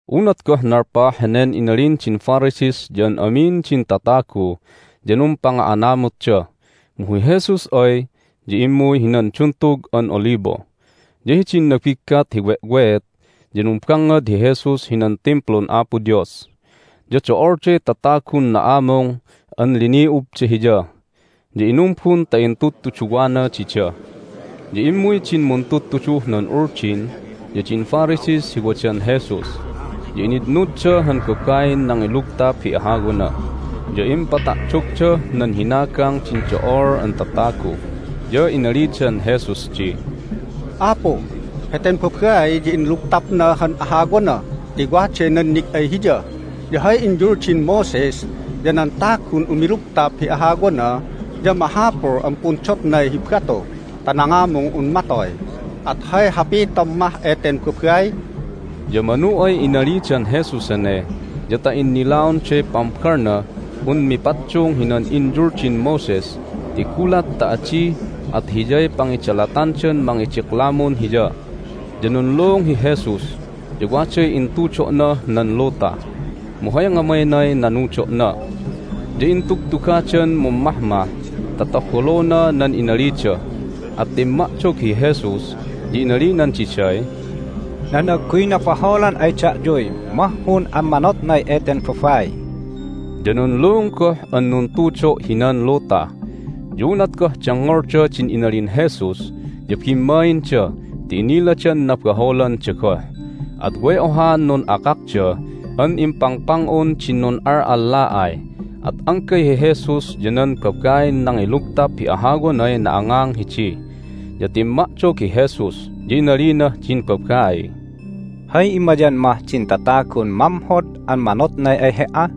Unat goh nalpah henen inalin din Pharisees ya an amin din tatagu ya numpanga'anamutda, mu hi Jesus ay ya immuy hinan Duntug an Olibo. Ya hidin nabiggat hi we'weet ya numbangngad hi Jesus hinan Timplun Apo Dios. Ya do'olday tatagun na'amung an lini'ubda Hiya, ya inumbun ta intudtuduwana dida. Ya immuy din muntudtuduh nan Uldin ya din Pharisees hi wadan Jesus, ya initnudda han babain nangilugtap hi ahawana, ya impata'dogdah nan hinagang din do'ol an tatagu. Ya inalidan Jesus di, "Apu, heten babai ya inlugtapna han ahawana ti waday nannig ay hiya. Ya hay inyuldin Moses ya nan tagun umilugtap hi ahawana ya mahapul an pundotnay hi batu ta nangamung un matoy. At hay hapitom mah eten babai?" Ya manu ay inalidan Jesus hene ya ta innilaonday pambalnah un mipaddung hinan inyuldin Moses ti gulat ta adi at hiyay pangidalatandan mangidiklamun Hiya. Ya nunluung hi Jesus, ya waday intudo'nah nan luta, mu hay ngamaynay nanudo'na. Ya intugtugadan mummahmah ta tabolona nan inalida, at timma'dog hi Jesus, ya inalinan diday, "Nan agguy nabaholan ay da'yuy mahhun an manotnay eten babai." Ya nunluung goh an nuntudo' hinan luta. Ya unat goh dengngolda din inalin Jesus ya bimmainda ti iniladan nabaholanda goh, at way ohaan nun'akakda an impangpang'un din nun'al'alla'ay. At anggay hi Jesus ya nan babain nangilugtap hi ahawanay na'angang hidi. Ya timma'dog hi Jesus, ya inalinah din babaiy, "Hay immayan mah din tatagun mamhod an manotnay ay he"a?"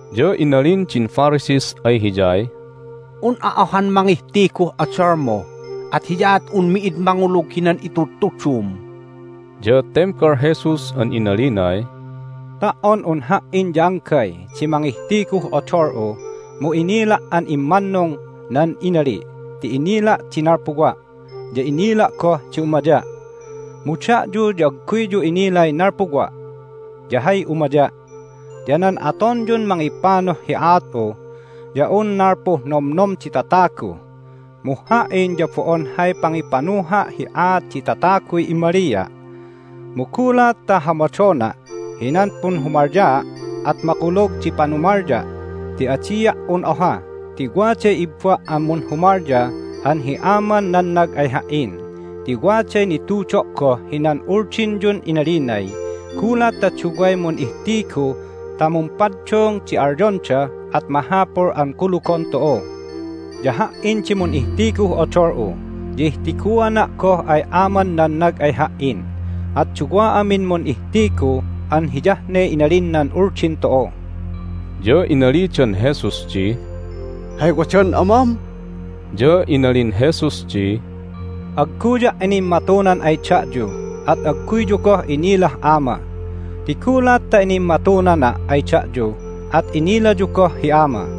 Ya inalin din Pharisees ay Hiyay, "Un'a ohan mangihtiguh odolmu, at hiyaat un mi'id mangulug hinan itudtudum!" Ya tembal Jesus an inalinay, "Ta"on un Ha"in ya anggay di mangihtiguh odol'u mu inila' an immannung nan inali' ti inila' di nalpuwa', ya inila' goh di umaya'. Mu da'yu ya agguyyu inilay nalpuwa' ya hay umaya'. Ya nan atonyun mangipanuh hi aat'u ya un nalpuh nomnom di tatagu, mu Ha"in ya bo'on hay pangipanuha' hi aat di tataguy immalia'. Mu gulat ta hamadona' hinan punhumalyaa' at makulug di panumalya' ti adia' un oha ti waday ibba' an munhumalya an hi Aman nannag ay Ha"in. Ti waday nitudo' goh hinan Uldinyun inalinay, Gulat ta duway mun'ihtigu ta mumpaddung di alyonda at mahapul an kulugon tu'u. Ya Ha"in di mun'ihtiguh odol'u, ya ihtiguana' goh ay Aman nannag ay Ha"in. At duwa amin mun'ihtigu an hiyah ne inalin nan Uldin tu'u." Ya inalidan Jesus di, "Hay wadan Amam?" Ya inalin Jesus di, "Agguya' inimmatunan ay da'yu, at agguyyu goh inilah Ama. Ti gulat ta inimmatunana' ay da'yu at inilayu goh hi Ama."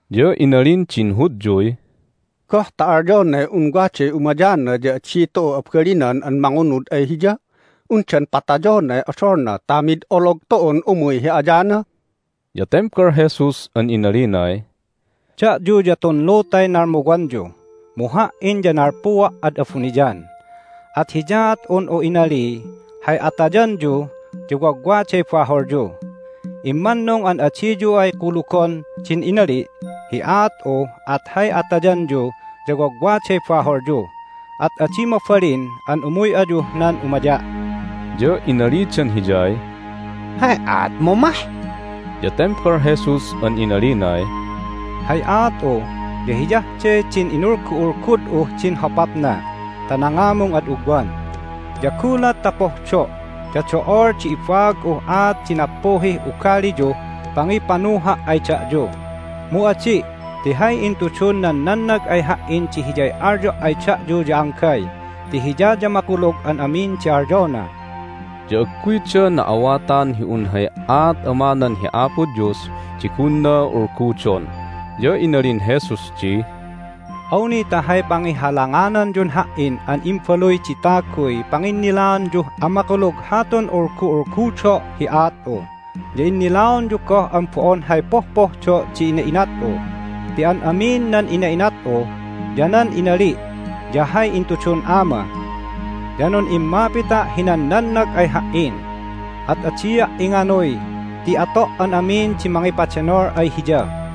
Ya inalin din Hudyuy, "Goh ta alyonay un waday umayana ya adi tu'u abalinan an mangunud ay Hiya? Undan patayonay odolna ta mid olog tu'un umuy hi ayana?" Ya tembal Jesus an inalinay, "Da'yu ya tun lutay nalmuwanyu, mu Ha"in ya nalpuwa' ad abuniyan. At hiyaat un'u inaliy, Hay atayanyu ya wagwaday baholyu. Immannung an adiyu ay kulugon din inali' hi aat'u at hay atayanyu ya wagwaday baholyu, at adi mabalin an umuy ayuh nan umaya'." Ya inalidan Hiyay, "Hay aatmu mah?" Ya tembal Jesus an inalinay, "Hay aat'u ya hiyah de din inulgu'ulgud'uh din hopapna ta nangamung ad ugwan. Ya gulat ta pohdo' ya do'ol di ibaag'uh aat di nappuhih ugaliyuh pangipanuha' ay da'yu. Mu adi' ti hay intudun nan nannag ay Ha"in di hiyay alyo' ay da'yu ya anggay ti Hiya ya makulug an amin di alyona." Ya agguyda na'awatan hi un hay aat Amanan hi Apo Dios di gunna ulgudon. Ya inalin Jesus di, "Awni ta hay pangihalangananyun Ha"in an Imbaluy di Taguy panginnilaanyuh amakulug hatun ulgu'ulgudo' hi aat'u ya innilaonyu goh an bo'on hay pohpohdo' di ina'inat'u, ti an amin nan ina'inat'u ya nan inali' ya hay intudun Ama. Ya nun'immapita' hinan nannag ay Ha"in, at adia' inganuy ti ato' an amin di mangipadenol ay Hiya."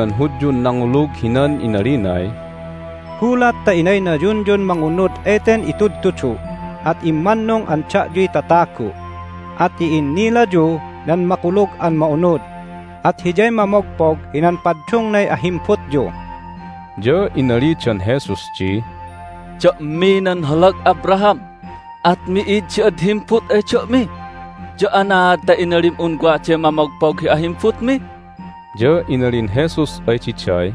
Inalin Jesus hinan Hudyun nangulug hinan inalinay, "Gulat ta inaynayunyun mangunud eten itudtudu' at immannung an da'yuy tatagu'. At i'innilayu nan Makulug an Ma'unud, at hiyay mamogpog hinan paddungnay ahimbutyu." Ya inalidan Jesus di, "Da'mi nan holag Abraham, at mi'id di ad himbut ay da'mi! Ya anaad ta inalim un waday mamogpog hi ahimbutmi?" Ya inalin Jesus ay diday,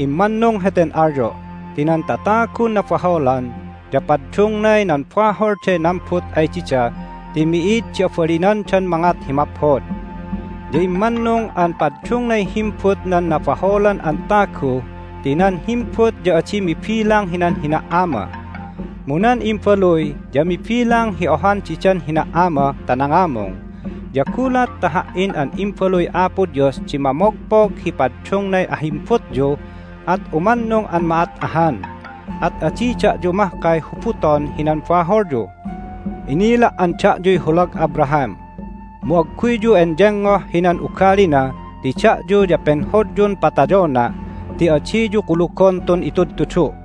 "Immannung heten alyo' ti nan tatagun nabaholan ya paddungnay nan baholday nambut ay dida ti mi'id di abalinandan mangat hi maphod. Ya immannung an paddungnay himbut nan nabaholan an tagu ti nan himbut ya adi mibilang hinan hina"ama. Mu nan imbaluy ya mibilang hi ohan didan hina"ama ta nangamung. Ya gulat ta Ha"in an Imbaluy Apo Dios di mamogpog hi paddungnay ahimbutyu at umannung an ma'at ahan, at adi da'yu mahkay hubuton hinan baholyu. Inila' an da'yuy holag Abraham, mu agguyyu enyengoh hinan ugalina ti da'yu ya penhodyun patayona' ti adiyu kulugon tun itudtudu'.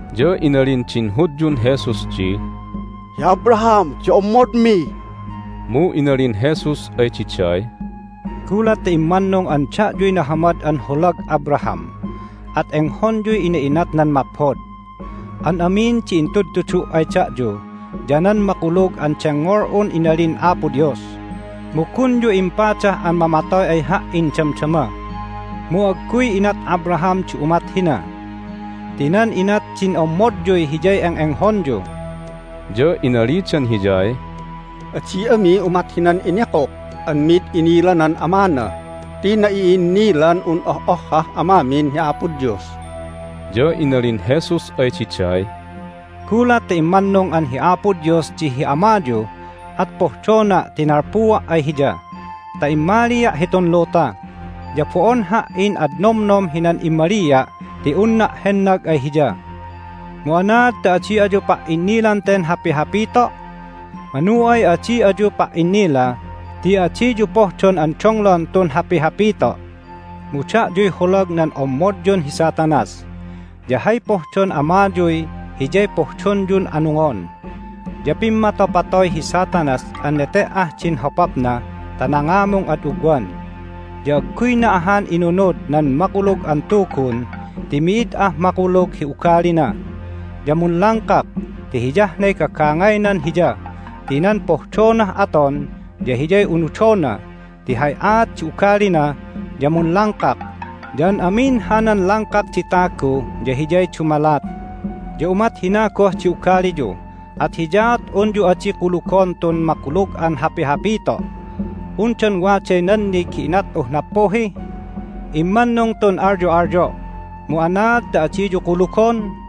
Ya inalin din Hudyun Jesus di, "Hi Abraham di ommodmi!" Mu inalin Jesus ay diday, "Gulat ta immannung an da'yuy nahamad an holag Abraham at enghonyuy ina'inatnan maphod. An amin di intudtudu' ay da'yu ya nan makulug an dengngol'un inalin Apo Dios, mu gunyu impadah an mamatoy ay Ha"in damdama. Mu agguy inat Abraham di umat hina! Ti nan inat din ommodyuy hiyay eng'enghonyu." Ya inalidan Hiyay, "Adi ami umat hinan inikuk an mid inilanan amana! Ti na'i'innilan un oh'ohhah amamin hi Apo Dios!" Ya inalin Jesus ay diday, "Gulat ta immannung an hi Apo Dios di hi Amayu at pohdona' ti nalpuwa' ay Hiya ta immalia' hitun luta. Ya bo'on Ha"in ad nomnom hinan immalia' ti unna' hennag ay Hiya. Mu anaad ta adi ayu pa"innilan ten hapihapito'? Manu ay adi ayu pa"innila ti adiyu pohdon an donglon tun hapihapito'. Mu da'yuy holag nan ommodyun hi Satanas, ya hay pohdon amayuy hiyay pohdonyun anungon! Ya pimmatopatoy hi Satanas an nete"ah din hopapna ta nangamung ad ugwan, ya agguyna ahan inunud nan Makulug an Tugun ti mi'id ah makulug hi ugalina. Ya munlangkak ti hiyah ne gagangaynan hiya ti nan pohdonah aton ya hiyay unudona ti hay aat di ugalina ya munlangkak, ya an amin hanan langkak di tagu ya hiyay dumalat. Ya umat hina goh di ugaliyu, at hiyaat unyu adi kulugon tun makulug an hapihapito'! Undan waday nannig hi inat'uh nappuhi? Immannung tun alyo'alyo', mu anaad ta adiyu kulugon?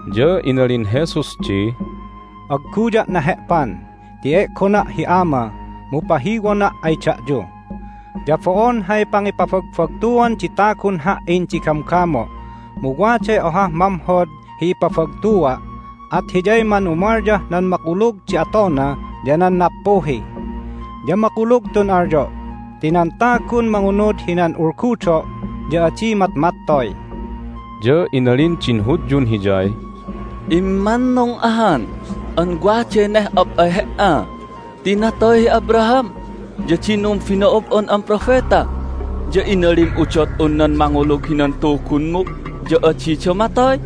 Ya inalin Jesus di, "Agguya' nahe'pan ti e'gona' hi Ama, mu pahiwona' ay da'yu. Ya bo'on hay pangipabagbagtuan di tagun Ha"in di gamgamo', mu waday ohah mamhod hi ipabagtua', at Hiyay manumalyah nan makulug di atona ya nan nappuhi. Ya makulug tun alyo' ti nan tagun mangunud hinan ulgudo' ya adi matmattoy." Ya inalin din Hudyun Hiyay, "Immannung ahan an waday neh'op ay He"a! Ti natoy hi Abraham ya din numbino'ob'on an propeta, ya inalim udot un nan mangulug hinan Tugunmu ya adida matoy?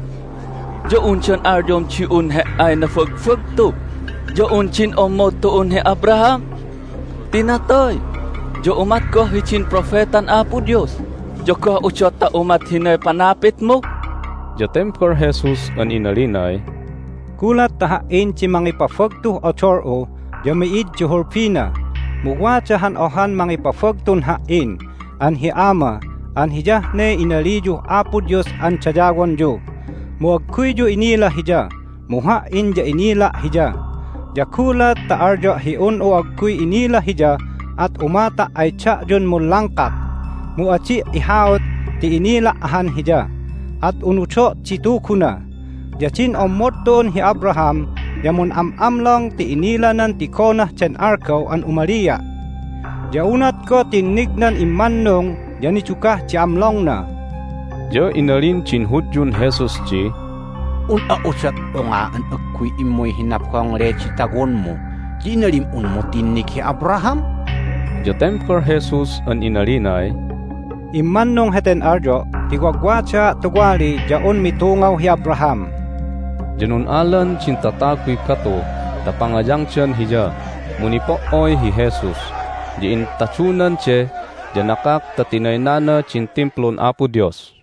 Ya undan alyom di un He"ay nabagbagtu ya un din ommod tu'un hi Abraham? Ti natoy, ya umat goh hidin propetan Apo Dios! Ya goh udot ta umat hinay panapitmu?" Ya tembal Jesus an inalinay, "Gulat ta Ha"in di mangipabagtuh odol'u ya mi'id di hulbina. Mu wada han ohan mangipabagtun Ha"in an hi Ama an hiyah ne inaliyuh Apo Dios an dayawonyu. Mu agguyyu inila Hiya, mu Ha"in ya inila' Hiya. Ya gulat ta alyo' hi un'u agguy inila Hiya at umata' ay da'yun munlangkak! Mu adi' ihaut ti inila' ahan Hiya, at unudo' di Tuguna. Ya din ommod tu'un hi Abraham ya mun'am'amlong ti inilanan tigonah den algaw an umalia'. Ya unat goh tinnignan immannung ya nidugah di amlongna." Ya inalin din Hudyun Jesus di, "Un'a udot unga an agguy immuy hi nabongle di tawonmu, ya inalim unmu tinnig hi Abraham?" Ya tembal Jesus an inalinay, "Immannung heten alyo' ti Wagwadaa' Tuwali ya un mitungaw hi Abraham!" Ya nun'alan din tataguy batu ta pangayangdan Hiya. Mu nipo"oy hi Jesus, ya intadunan de ya nakak ta tinaynana din Timplun Apo Dios.